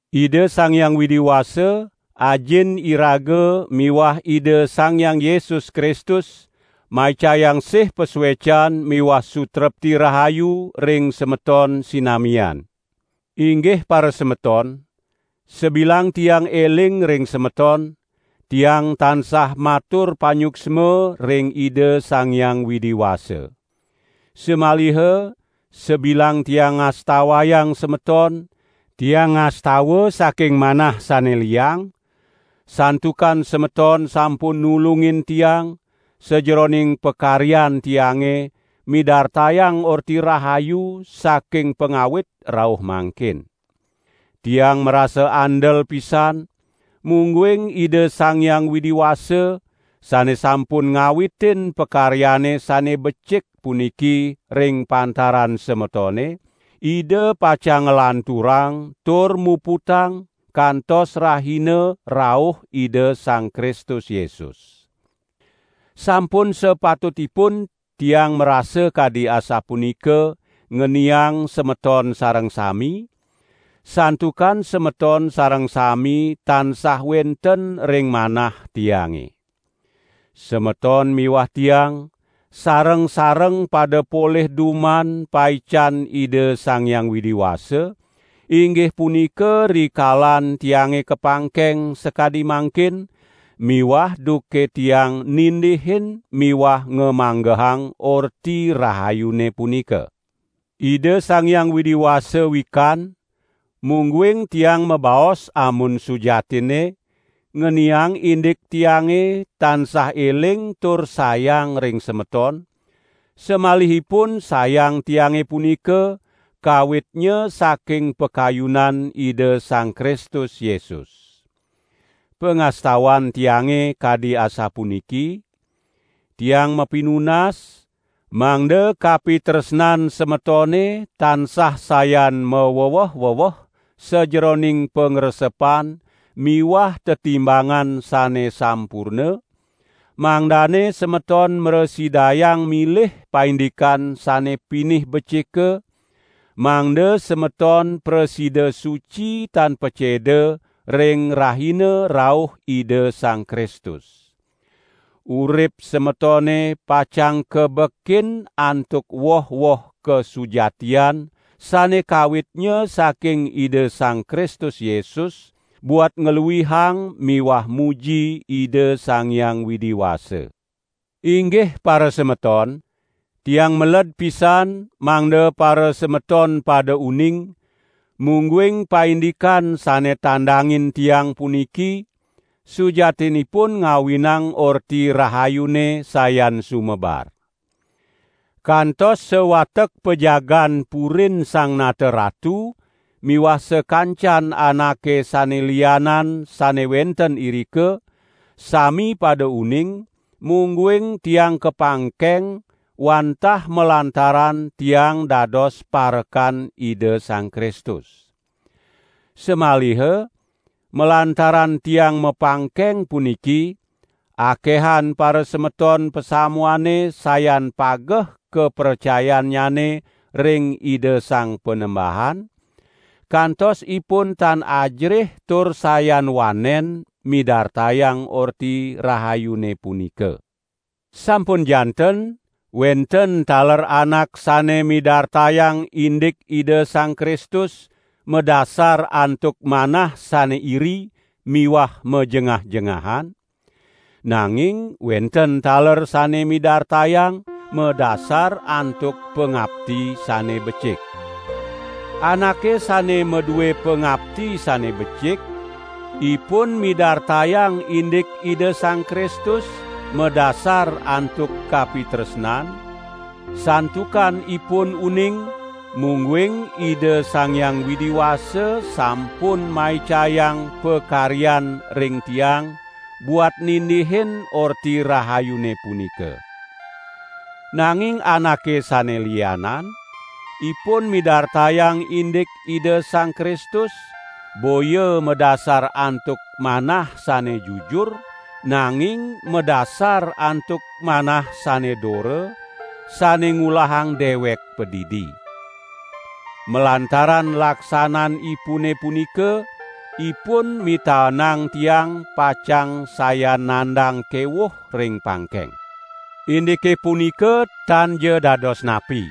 Ida Sang Hyang Widi Wasa, Ajin iraga miwah Ida Sang Hyang Yesus Kristus maicayang sih pasuecan miwah sutrepti rahayu ring semeton sinamian. Inggih parasemeton, sabilang tiang eling ring semeton, tiang tansah matur panyuksma ring Ida Sang Hyang Widi Wasa. Samaliha sabilang tiang ngastawayang semeton, tiang ngastawa saking manah sane liang, santukan semeton sampun nulungin tiang sajeroning pakaryan tiange midartayang Orti Rahayu saking pangawit rauh mangkin. Tiang marasa andel pisan, mungguing Ida Sang Hyang Widi Wasa, sane sampun ngawitin pakaryane sane becik puniki ring pantaran semetone, Ida pacang nglanturang tur muputang kantos rahina rauh Ida Sang Kristus Yesus. Sampun sapatutipun tiang marasa kadi asapunika ngeniang semeton sareng sami, santukan semeton sareng sami tansah wenten ring manah tiange. Semeton miwah tiang, sareng-sareng pada polih duman paican Ida Sang Hyang Widi Wasa, inggih punika rikalan tiange kapangkeng sakadi mangkin miwah duke tiang nindihin miwah ngamanggehang Orti Rahayune punika. Ida Sang Hyang Widi Wasa wikan, mungguing tiang mabaos amun sujatinne, ngeniang indik tiange tansah eling tur sayang ring semeton, samalihipun sayang tiange punika kawitnya saking pakayunan Ida Sang Kristus Yesus. Pangastawan tiange kadi asapuniki: Tiang mapinunas, mangda kapitresnan semetone tansah sayan maweweh-weweh sajeroning pangresepan miwah tetimbangan sane sampurna, mangdane semeton mrasidayang milih paindikan sane pinih becika, mangda semeton prasida suci tan paceda ring rahina rauh Ida Sang Kristus. Urip semetone pacang kabekin antuk woh-woh kasujatian sane kawitnya saking Ida Sang Kristus Yesus, buat ngluihang miwah muji Ida Sang Hyang Widi Wasa. Inggih parasemeton, tiang meled pisan, mangda parasemeton pada uning, mungguing paindikan sane tandangin tiang puniki, sujatinipun ngawinang Orti Rahayune sayan sumebar. Kantos sawatek pajagaan purin Sang Nata Ratu miwah sakancan anake sane lianan sane wenten irika, sami pada uning, mungguing tiang kapangkeng wantah malantaran tiang dados parekan Ida Sang Kristus. Samaliha, malantaran tiang mapangkeng puniki, akehan parasemeton pasamuane sayan pageh kapracayannyane ring Ida Sang Panembahan, kantos ipun tan ajerih tur sayan wanen midartayang Orti Rahayune punika. Sampun janten wenten taler anak sane midartayang indik Ida Sang Kristus madasar antuk manah sane iri miwah majengah-jengahan, nanging wenten taler sane midartayang madasar antuk pangapti sane becik. Anake sane madue pangapti sane becik, ipun midartayang indik Ida Sang Kristus madasar antuk kapitresnan, santukan ipun uning, mungguing Ida Sang Hyang Widi Wasa sampun maicayang pakaryan ring tiang buat nindihin Orti Rahayune punika. Nanging anake sane lianan, ipun midartayang indik Ida Sang Kristus boya madasar antuk manah sane jujur, nanging madasar antuk manah sane dora, sane ngulahang dewek padidi. Malantaran laksananipune punika, ipun mitaenang tiang pacang sayan nandang kewuh ring pangkeng. Indike punika tanja dados napi!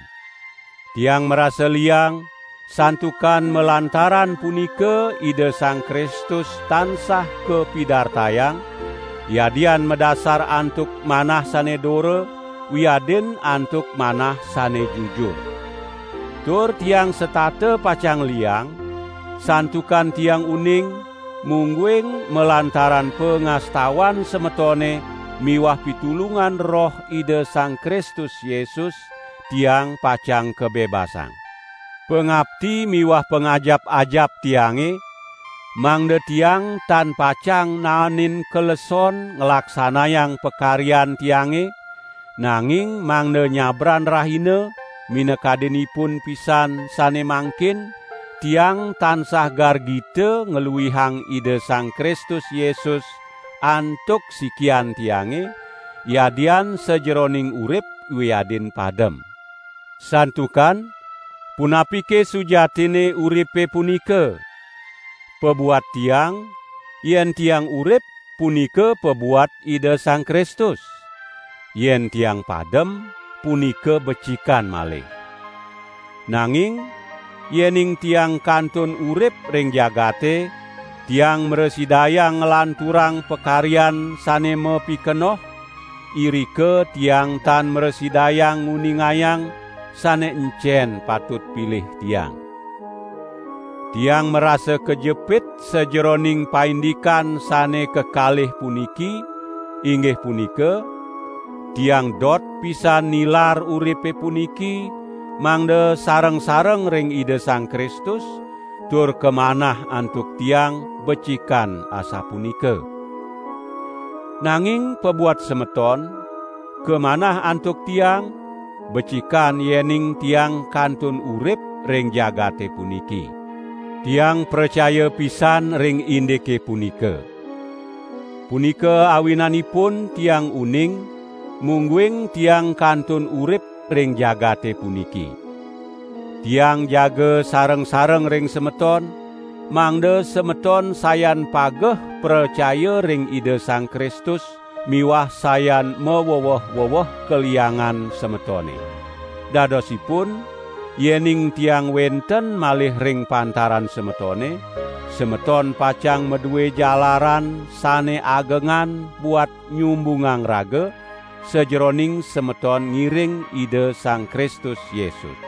Tiang marasa liang, santukan malantaran punika Ida Sang Kristus tansah kapidartayang, yadian madasar antuk manah sane dora, wiadin antuk manah sane jujur. Tur tiang setata pacang liang, santukan tiang uning, mungguing malantaran pangastawan semetone miwah pitulungan Roh Ida Sang Kristus Yesus, tiang pacang kabebasang. Pangapti miwah pangajap-ajap tiange, mangda tiang tan pacang naenin kaleson nglaksanayang pakaryan tiange, nanging mangda nyabran rahina, minakadinipun pisan sane mangkin, tiang tansah gargita ngluihang Ida Sang Kristus Yesus antuk sikian tiange, yadian sajeroning urip wiadin padem. Santukan, punapike sujatine uripe punika? Pabuat tiang, yen tiang urip, punika pabuat Ida Sang Kristus. Yen tiang padem, punika becikan malih. Nanging yening tiang kantun urip ring jagate, tiang mrasidayang nglanturang pakaryan sane mapikenoh, irika tiang tan mrasidayang nguningayang, sane encen patut pilih tiang. Tiang marasa kajepit sajeroning paindikan sane kekalih puniki, inggih punika: tiang dot pisan nilar uripe puniki, mangda sareng-sareng ring Ida Sang Kristus, tur kamanah antuk tiang becikan asapunika. Nanging pabuat semeton, kamanah antuk tiang, becikan yening tiang kantun urip ring jagate puniki. Tiang pracaya pisan ring indike punika. Punika awinanipun tiang uning, mungguing tiang kantun urip ring jagate puniki. Tiang jaga sareng-sareng ring semeton, mangda semeton sayan pageh pracaya ring Ida Sang Kristus miwah sayan maweweh-weweh kaliangan semetone. Dadosipun, yening tiang wenten malih ring pantaran semetone, semeton pacang madue jalaran sane agengan buat nyumbungang raga, sajeroning semeton ngiring Ida Sang Kristus Yesus.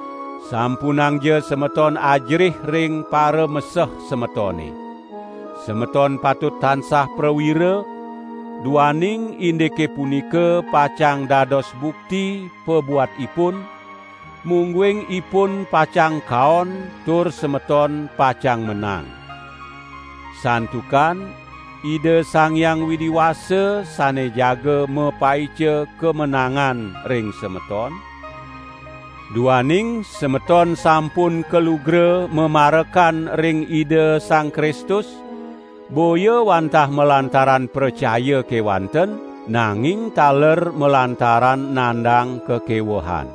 Sampunangja semeton ajerih ring parameseh semetone. Semeton patut tansah prawira, duaning indike punika pacang dados bukti pabuat ipun, mungguing ipun pacang kaon tur semeton pacang menang. Santukan Ida Sang Hyang Widi Wasa sane jaga mapaica kamenangan ring semeton, duaning semeton sampun kalugra mamarekan ring Ida Sang Kristus, boya wantah malantaran pracaya kewanten, nanging taler malantaran nandang kakewehan.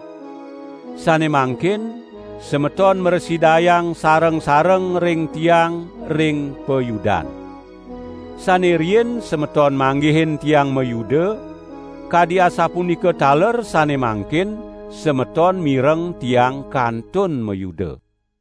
Sane mangkin semeton mrasidayang sareng-sareng ring tiang ring payudan. Sane riin semeton manggihin tiang mayuda, kadi asapunika taler sane mangkin semeton mireng tiang kantun mayuda.